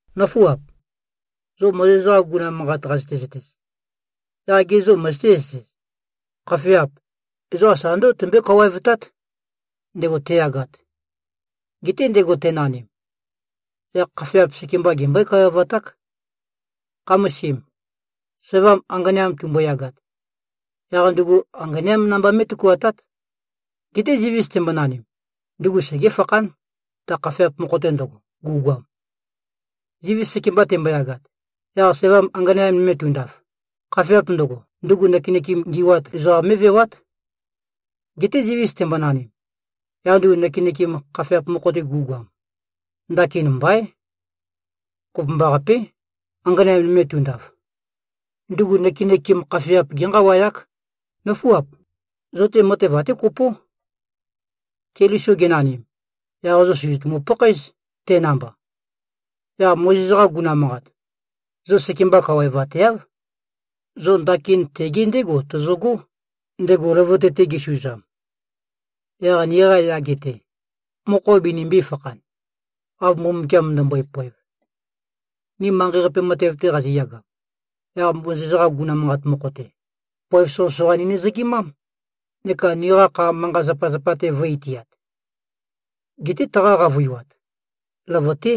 Nǿfuap! Zo Mozes-qa guguna manqat qazøte-zøtez, yaq gê, zo møzøté-zøtez? Khafeap, ezoqa sa ndǿgo tømbøé-kawaevtát, ndego teyagat. Geté ndego tenanim, yaq khafeap sekemba gembøé-kawaevaták. Khamasim, sævam anganeam tumboyagat, yaq ndugu anganeám namba mé꞉tøkuatát. Geté zivis tembonanim, ndugu segéfakhán, ta khafeap mokho-te ndøgo, gu꞉goam. Zivis sekemba temboyagat, yaq sævam anganeam nøme tundaf, khafeap ndøgo, ndugu nøkenøkem ngi꞉wat ezoqam mé꞉vewát. Geté zivis tembonanim, yaq ndugu nøkenøkem khafeap mokho-te gu꞉goam, ndakin mbaín. Kopømbaqapé, anganeam nøme tundaf. Ndugu nøkenøkem khafeap génqawayák. Nǿfuap! Zo-te matev até kopó. Keliso genanim, yaq zo sø̀zøtumu-pakhaéz, te namba. Yaq Mozes-qa guguna manqat, zo sekemba kawaevateáv. Zo ndakin tege ndégo tozogó, ndego løvøte-te gesuzam. Yaq niqa yage-te, mokho binimbī-fakhan, av Mbumbukiam ndømbøe-poev. Ni manqei-qape matev-te qaziyagam, yaq Mozes-qa guguna manqat mokho-te, poev soqøsoqa ninøzøgimám, neka niqa kha manqa-zapazapa-te vø̄-itiat. Geté taqa qavøiwat, løvøté.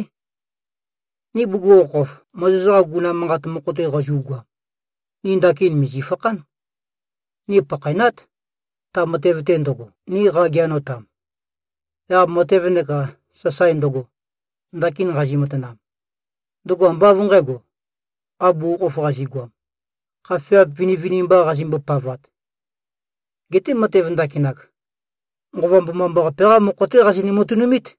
Ni bugukhokhof Mozes-qa guguna manqat mokho-te qazu꞉goam, ni ndakin mìzifakhán. Ni pakhaenát, ta matev-te ndøgo, ni qageanotam. Yaq matev neka sasae ndøgo, ndakin nqazi-matanam, ndøgo ambá av nqǣgo, av bugukhokhof qazi꞉goam, khafeap vinivinimba qazimbo-pavat. Geté matev ndakinak, Nqova Mbomambaqape-qá mokho-té qazinø-matønumít.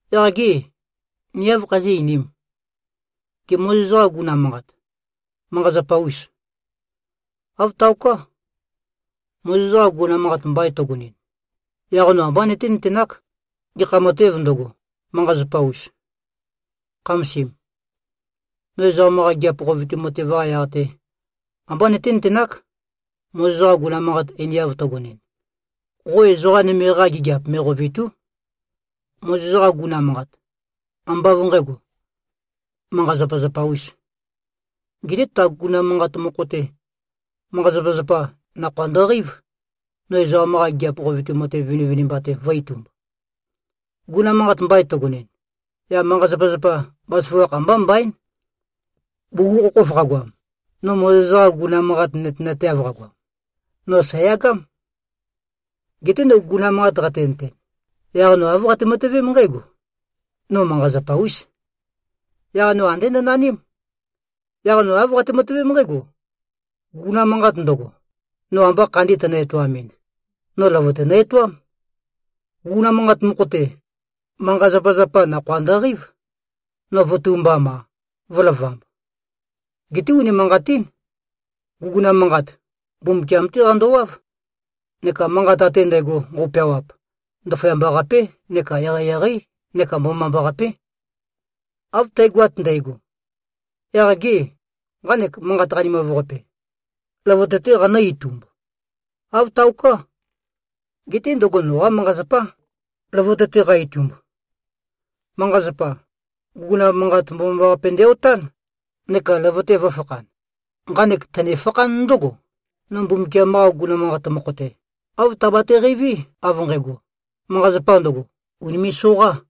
Yaq gê, ni áv khazí꞉-einīm? Gê, Mozes-qa guguna manqat, manqa-zapa-ûs? Āv taoká. Mozes-qa guguna manqat mbain tøgonɨn, yaq no ambá nøténøtenák, gekha matēv ndøgo, manqa-zapa-us. Khamasim. No ezoqam-qa gigiap qovetu matev-qa yaq-te, ambá nøténøtenák, Mozes-qa guguna manqat einiav tøgonɨn, “Qo ezoqa nøme-qa gigiap me꞉qovètu᷄.” Mozes-qa guguna manqat, ambá av nqǣgo, manqa-zapazapa-ūs. Geté ta guguna manqat mokho-te, manqa-zapazapa, nakhoa ndøqeív, no ezoqam-qa gigiap qovetu matev vinivinimba-te vø̄-itumb. Guguna manqat mbain tøgonɨn, yaq manqa-zapazapa, bazaføgakh ambá mbaín. Bugukhokhof qagoam, no Mozes-qa guguna manqat nøtenateav qagoam, no sæ̀yagám. Geté no guguna manqat qatenøten, yaq no āv qate-matøvém nqǽgo: No manqa-zapa-ús. Yaq no andé nønaním. Yaq no āv qate-matøvém nqǽgo: Guguna manqat ndøgo, no amba khandi tønø-etoamɨn, no løvøte nø-etoám. Guguna manqat mokho-te, manqa-zapazapa, nakhoa ndøqeív, no vø̄tumbam-a, vø̄lavamb. Geté unimanqatín. Guguna manqat, Mbumbukiam-té qandowáv, neka manqat ate ndægo nqøu-peawap, ndaføyamba-qapé neka eqeieqeí neka mbomambaqapé. Av tægoat ndægo, yaq gê, nqanek manqat qanimav-qape, løvøte-té qanǿ-itumb? Āv taoká. Geté ndøgo noqá manqa-zapá, løvøte-te qa-itumb. Manqa-zapa, guguna manqat mbomambaqape ndæ-otán, neka løvøte vø̄fakhan. Nqanek tønefakhán ndǿgo: No Mbumbukiam-qa guguna manqat mokho-te, āv tabate-qeiví, av nqægo, manqa-zapa ndøgo, ùnime꞉-soqá.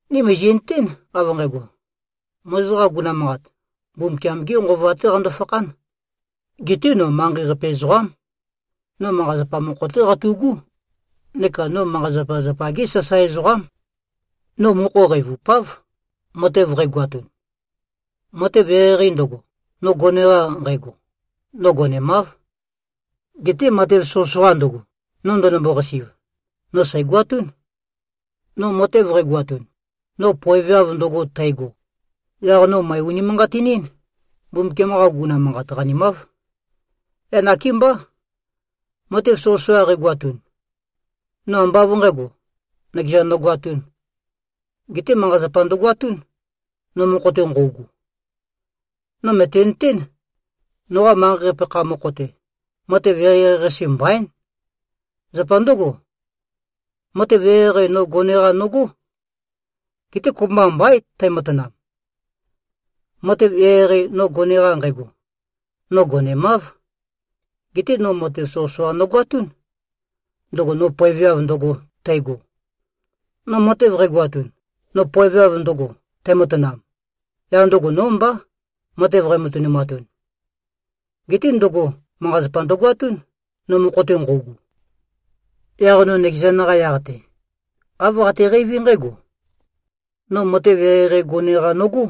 Ni mìzi꞉nøtén, av nqægo: Mozes-qa guguna manqat, Mbumbukiam-gé Nqova-té qando-fakhán. Geté no manqei-qape ezoqám. No manqa-zapa mokho-té qatu꞉gú. Neka no manqa-zapazapa-gé sasae ezoqám. No mokho qeivupáv, matev qægoatun. Matev eqeieqei ndøgo, no gone-qa nqægo, no gonemáv. Geté matev soqøsoqa ndøgo, no ndønømbo-qasi꞉v, no sæ̀goatún. No matev qægoatun, no poeveav ndøgo, tægo, yaq no mø̀e-unimanqatinín, Mbumbukiam-qa guguna manqat qanimáv. Yaq nakémbá, matev soqøsoqa qægoatun, no ambá av nqǣgo, nøkezan nogoatūn. Geté manqa-zapa ndøgoatún, no mokho-te nqøugu. No mø̀tenøtén, noqa manqei-qape kha mokho-te, matev eqeieqei-qase mbaín. Zapa ndǿgo, matev eqeieqei, no gone-qa nogó. Geté kopømba mbaín tæmatanam. Matev eqeieqei, no gone-qa nqægo, no gonemáv. Geté, no matev soqøsoqa nogoatún, ndøgo no poeveav ndøgo, tægo. No matev qægoatun, no poeveav ndøgo, tæmatanam, yaq ndøgo nó mbá, matev qæmatønumatun. Geté ndøgo, manqa-zapa ndøgoatún, no mokho-te nqøugu. Yaq no nøkezan-qa yaq-te, āv qateqeiví nqǽgo: No matev eqeieqei gone-qa nogó.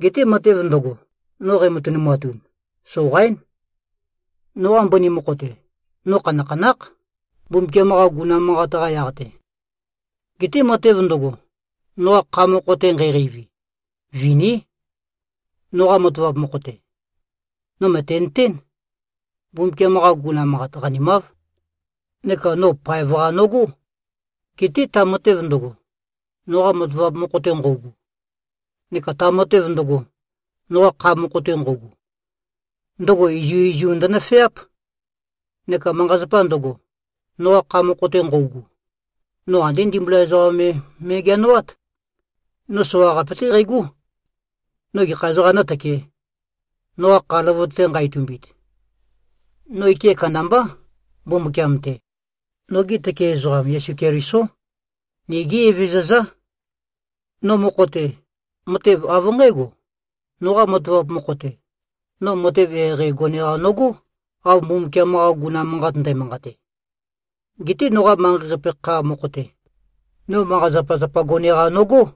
Geté matev ndøgo, no qæmatønumatun, soqaín. Noqa mbøni mokho-te, no khanakhanákh, Mbumbukiam-qa guguna manqat-qa yaq-te. Geté matev ndøgo, noqa kha mokho-te nqæqeivi, viní. Noqa matavap mokho-te, no mø̀tenøtén, Mbumbukiam-qa guguna manqat qanimáv, neka no paev-qa nogó. Geté ta matev ndøgo, noqa matavap mokho-te nqøugu, neka ta matev ndøgo, noqa kha mokho-te nqøugu, ndøgo izuizu ndønøfeáp. Neka manqa-zapa ndøgo, noqa kha mokho-te nqøugu, no andé ndimbula ezoqa me me꞉geanoát. No soqaqape-té qægó. No gekha ezoqām nǿtøkē, noqa kha løvøte-te nqa-itumbit? No ike kandambá, Mbumbukiam-te. Noge tøke ezoqam, Yesu Kelisó. Nigí Evezøzá. No mokho-te, matev av nqǽgo: Noqa matavap mokho-te, no matev eqeieqei gone-qa nogó, av Mbumbukiam-qa guguna manqat ndæmanqate. Geté noqa manqei-qape kha mokho-te, no manqa-zapazapa gone-qa nogó.